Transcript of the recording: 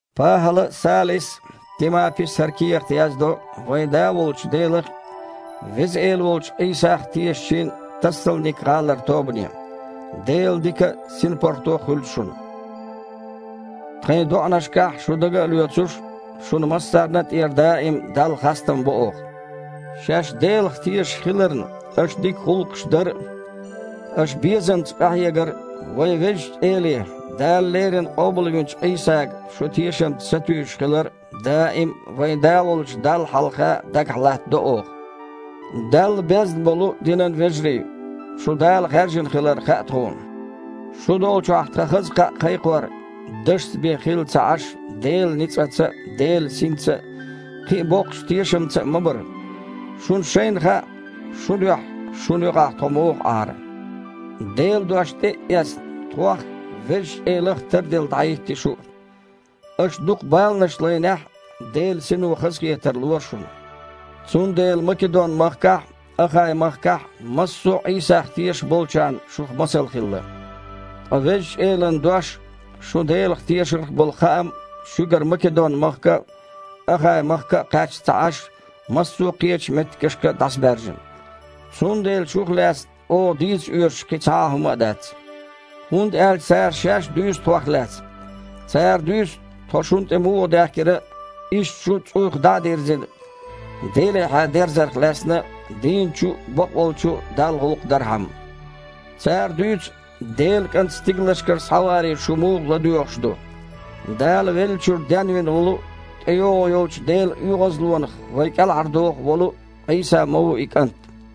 ПахІала а, Салис а, Тимапис а хІара кехат яздо вайн Да волчу Делах а, Веза Эла волчу Іийсах а тешачийн Тассалник-гІалара тобане. Делан дика а, синпаргІато а хуьлда шуна. Тхайн доІанашкахь, шу дага а лоьцуш, шуна массарна тІера даим Далла хастам бо оха. Шаьш Делах тешаш хиларна, аша дика гІуллакхаш дар а, аша безамца къахьегар а, вайн Везачу Эле, Дала леррина къобалвинчу Іийсага шу тешамца сатуьйсуш хилар а даим а вайн Да волчу Далла хьалха дагахь латтадо оха. Далла безна болу динан вежарий, шу Дала хаьржина хилар хаьа тхуна. Шу долчохь тхан хаза кхаъ кхайкхор дашца бен хилла ца Іаш, Делан ницкъаца а, Делан Синца а, кхин а боккхачу тешамца а ма бара. Шуна шайна хаьа, шун дуьхьа шуна юкъахь тхо муха Іара. Делан дош тІе а эцна, тхох а, Везачу Элах а тарделла дІахІитти шу а. Аша дукха баланаш лайнехь а, Делан Сино хазахетар лора шуна. Цундела Македон-махкахь а, Ахай-махкахь а массо а Іийсах тешаш болчарна шух масал хилла. Ткъа Везачу Элан дош а, шун Делах тешарх болу хаам а шуьгара Македон-махка а, Ахай-махка а кхаьчна ца Іаш, массо а кхечу меттигашка а дІасабаьржина. Цундела шух лаьцна оха дийца оьшуш кхин цхьа а хІумма дац. ХІунда аьлча цара шаьш а дуьйцу тхох лаьцна. Цара дуьйцу, тхо шуна тІе муха даьхкира а, иштта шу, цІуйх дІа а дирзина, Делехьа дерзарх лаьцна а, дийначу а, бакъволчу а Далла гІуллакх дархьама. Цара дуьйцу, Делан КІант стигалшкара схьаваре шу муха ладоьгІуш ду. Дала веллачуьра денвина волу а, тІейогІу йолчу Делан оьгІазлонах вай кІелхьардоху волу а Іийса ма ву и КІант.